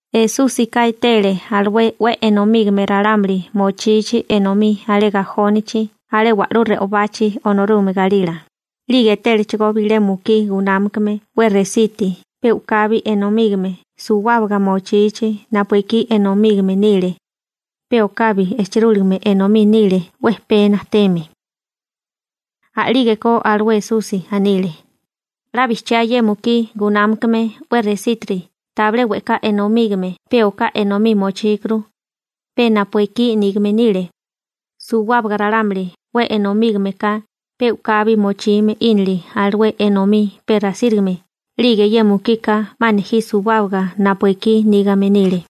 Esúsika etele alué 'we enomígame ralámuli mochichi enomí alé gajónichi alé wa'lú re'obachi Onorúgame galila, 'lige etélechigó bilé mukí gunámakame 'we resiti pe u'kabi enomígame suwábaga mochichi napu ekí enomígame nile, pe okabi ejchirúligame enomí nile 'we pee najteme. A'lígeko alué Esusi anile: ―'La bijchiá ye mukí gunámakame 'we resítiri tabilé we'ká enomígame pe oká enomí mochíkuru, pe napu ekí nígame nile. Suwábaga ralámuli 'we enomígame ka pe u'kabi mochime 'ínile alué enomí pe rasírigame 'lige ye mukika 'ma nejí suwábaga napu ekí nígame nile.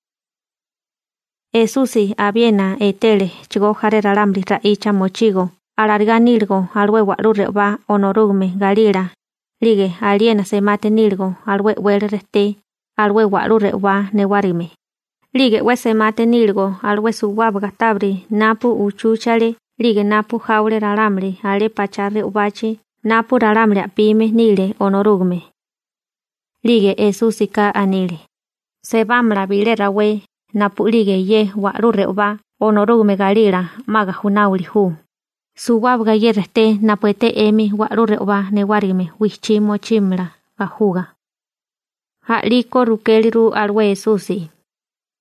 Esusi abiena etélechigó jaré ralámuli ra'icha mochigo alarigá níligo alué wa'lú re'obá Onorúgame galila, 'lige aliena semati níligo alué e'wele rejté alué wa'lú re'obá newárigime, 'lige 'we semati níligo alué suwábaga tábiri napu uchúchale 'lige napu jáwale ralámuli alé pachá re'obachi napu ralámuli a'pime nile Onorúgame. 'Lige Esúsika anile: ―Sebámala bilé rawé napu'lige ye wa'lú re'obá Onorúgame galila 'ma gajunáwili ju, suwábaga ye rejté napu eté 'emi wa'lú re'obá newárigime wijchí mochímala gajuga. A'liko rukéliru alué Esusi: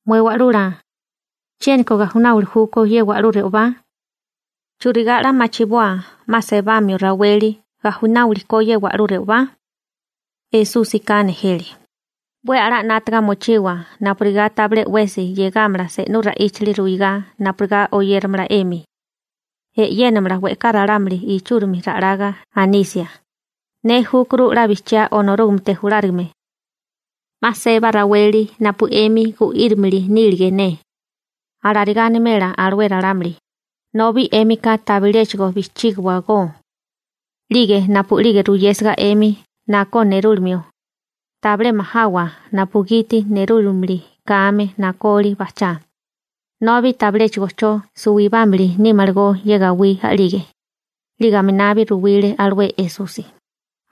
―Mué Wa'lula, ¿chiéniko gajunáwili júkó ye wa'lú re'obá? ¿Churigá 'la machiboa 'ma sebamio raweli gajunáwili ko ye wa'lú re'obá? Esúsika nejele: ―'We a'lá 'nátaga mochiwa napurigá tabilé 'wesi 'yégamala se'nú ra'íchali ruigá napurigá oyéramala 'emi. E'yénamala we'ká ralámuli ichúrimi ra'laga anisia: «Ne júkuru 'la bijchiá Onorúgamete julárigame. 'Ma seba raweli napu 'emi gu'írimili nílige ne.» Alarigá animela alué ralámuli, nobi 'émika tabiléchigo bijchígiwagó. ―'Lige napu'lige ruyésiga 'emi nakó nerúlimio, tabilé majawa napugiti nerúlimili kame nakoli bajchá, nobi tabiléchigo 'cho suwibámili nímalagó ye gawí a'lige. 'Lige aminabi ruwile alué Esusi: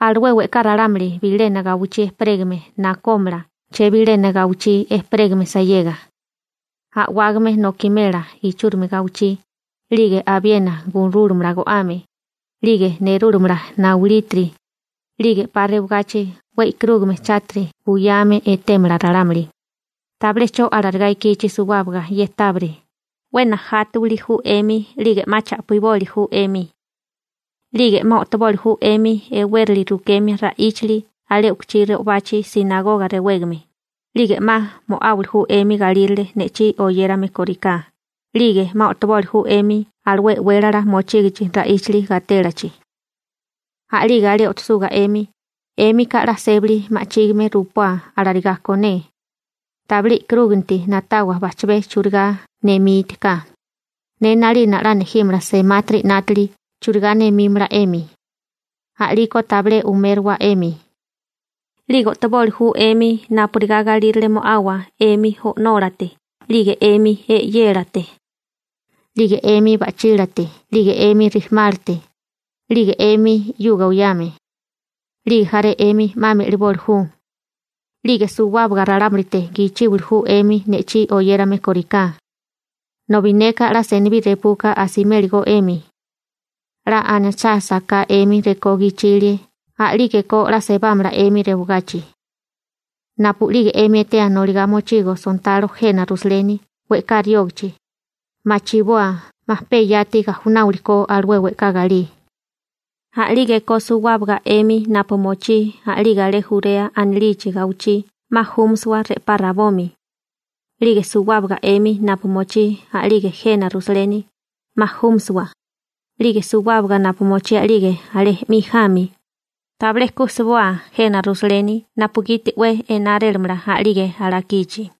―Alué we'ká ralámuli bilena gawichí ejperégame nakómala chebilena gawichí ejperégame sayega. A'wágame nokimela ichúrimi gawichí, 'lige abiena gurúlamala go'ame, 'lige nerúlamala naulítiri, 'lige 'pa rewagachi 'we e'karúgame chátiri buyame etémala ralámuli. › Tabilé 'cho alarigá ikichi suwábaga ye tábiri, 'we najátawili ju 'emi 'lige 'ma cha'piboli ju 'emi. 'Lige 'ma o'toboli ju 'emi e'wérali rukemia ra'íchali alé u'kuchí re'obachi «sinagoga» rewégame, 'lige 'ma mo'áwili ju 'emi galírale ne'chí oyérame kóriká, 'lige 'ma o'toboli ju 'emi alué e'wélala mochígichi ra'íchali gatélachi. A'lige alé o'tosuga 'emi, 'émika 'la sébali ma'chígime rupoa alarigá ko ne. Tabilé e'karúganti na'tawa bajchabé churigá nemítiká, ne 'nalina 'la nejímala semátiri 'nátili churigá nemímala 'emi. A'liko tabilé umérowa 'emi. 'Lige o'toboli ju 'emi napurigá galírale mo'awa 'emi o'nólate 'lige 'emi e'yélate, 'lige 'emi ba'chílate 'lige 'emi rijimálate, 'lige 'emi 'yuga oyame. 'Lige jaré 'emi 'ma me'liboli ju. 'Lige suwábaga ralámulite gichíwili ju 'emi ne'chí oyérame kóriká, nobi neka 'la senibí repuka asimélagó 'emi. 'La anachásaká 'emi rekó gichilie a'lígeko 'la sebámala 'emi rewagachi. › Napu'lige 'emi etea noligá mochigo sontalo jena Rusaleni we'ká riógachi, machiboa 'ma pe yati gajunáwili ko alué we'ká galí. A'lígeko suwábaga 'emi napu mochí a'lige alé Jurea anilichi gawichí 'ma júmasiwa re'pá rabomi. 'Lige suwábaga 'emi napu mochí a'lige jena Rusaleni, 'ma júmisiwa. 'Lige suwábaga napu mochí a'lige alé 'mi jami, tabilé ku sboa jena Rusaleni napugiti 'we enárélamala a'lige alakichi.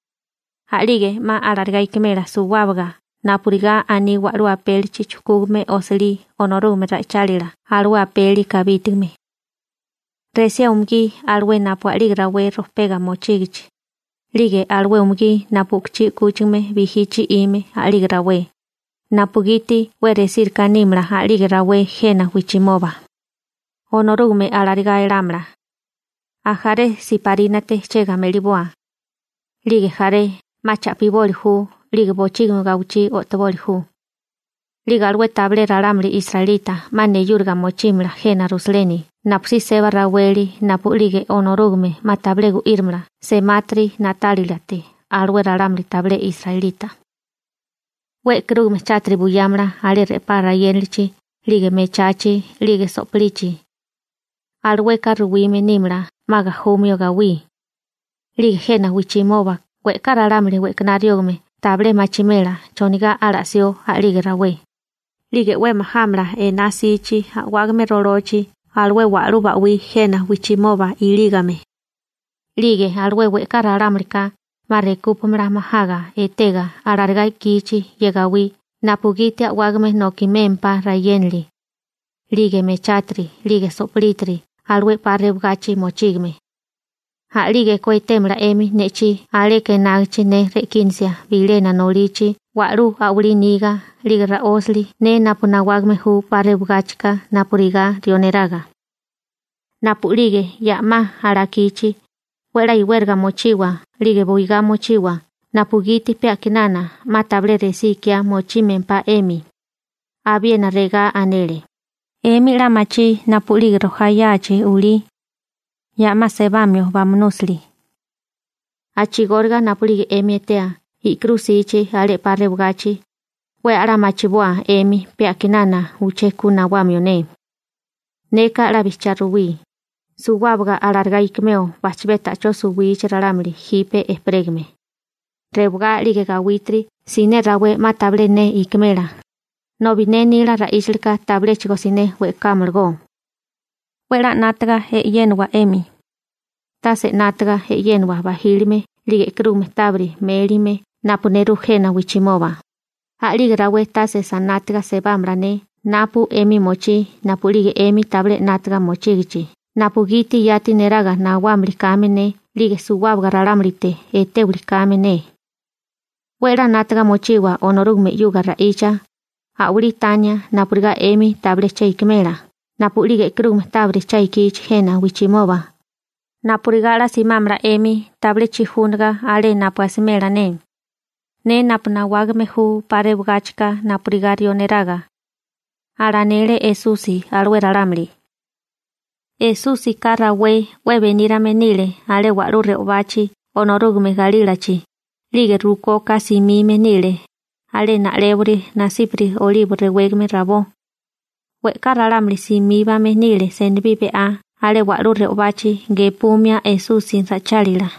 A'lige 'ma alarigá ikimela suwábaga napurigá aní wa'lú apélichi chujkúgame osilí Onorúgame ra'ichálila alué apeli kabítigame. Resía umugí alué napu a'lige rawé rojpega mochígichi, 'lige alué umugí napu u'kuchí 'kúchigame bijí chi'ime a'lige rawé, napugiti 'we resíriká nímala a'lige rawé jena wijchimoba. Onorúgame alarigá elámala. Ajaré siparínate ejchega me'liboa, 'lige jaré 'ma cha'piboli ju 'lige bochígimi gawichí o'toboli ju. 'Lige alué tabilé ralámuli israelita 'ma neyúriga mochímala jena Rusaleni napusí seba raweli napu'lige Onorúgame 'ma tabilé gu'írimala semátiri na'tálilate alué ralámuli tabilé israelita. › 'We e'karúgame chátiri buyámala alé re'pá rayénalichi 'lige mechachi 'lige so'pilichi. Alueka ruwime nímala 'ma gajumio gawí. 'Lige jena wijchimoba we'ká ralámuli we'kaná riógame tabilé machimela chonigá ala'sió a'lige rawé, 'lige 'we majámala ená 'sichi a'wágame rolochi alué wa'lú ba'wí jena wijchimoba ilígame. 'Lige alué we'ká ralámulika 'ma rekupámala majaga etega alarigá ikíichi ye gawí napugiti a'wágame nokimémpá rayénali, 'lige mechátiri, 'lige so'plítiri alué 'pa rewagachi mochígame. A'lígeko etémala 'emi ne'chí aleka enágichi ne re'kínasia bilena nolichi wa'lú a'walí niga 'lige ra'ósali ne napu nawágame ju 'pa rewagáchika napurigá rió neraga. Napu'lige ya 'ma alakichi, 'we a'lá iwériga mochiwa 'lige buigá mochiwa napugiti pe a'kinana 'ma tabilé resí ikiá mochímempá 'emi. Abiena regá anele: ―'Emi 'la machí napu'lige rojá yáachi, a'kinana sebamio bamunúsili. A'chigóriga napu'lige 'emi etea i'kirú ikichi alé 'pa rewagachi, 'we a'lá machiboa 'emi pe a'kinana uché ku nawamio ne. › Neka 'la bijchiá ruwí, suwábaga alarigá ikimeo bajchabé ta'chó suwichi ralámuli jipe ejperégame. Rewagá 'lige gawítiri siné rawé 'ma tabilé ne ikimela, nobi ne nila ra'íchalika tabiléchigo siné we'kámalagó. › 'We 'la 'nátaga e'yénawa 'emi, tase 'nátaga e'yénawa bajílime 'lige e'karúgame tábiri mélime napu nerú jena wijchimoba, a'lige rawé tase sanátiga sebámala ne napu 'emi mochí napu'lige 'emi tabilé 'nátaga mochígichi napugiti yati neraga nawámili kame ne 'lige suwábaga ralámulite etéwili kame ne. 'We 'la 'nátaga mochiwa Onorúgame 'yuga ra'icha, a'walí tania napurigá 'emi tabilé che ikimela napu'lige e'karúgame tábiri cha ikichi jena wijchimoba, napurigá 'la simámala 'emi tabilé chijúniga alé napu asimela ne, ne napu nawágame ju 'pa rewagáchika napurigá rió neraga ―alanele Esusi alué ralámuli. Esúsika rawé 'we benírame nile alé wa'lú re'obachi Onorúgame galílachi, 'lige rukoka simime nile alé na'lébori nasípari Olibo rewégame rabó. We'ká ralámuli simíbame nile senibí be'á alé wa'lú re'obachi gepumia Esusi ra'ichálila.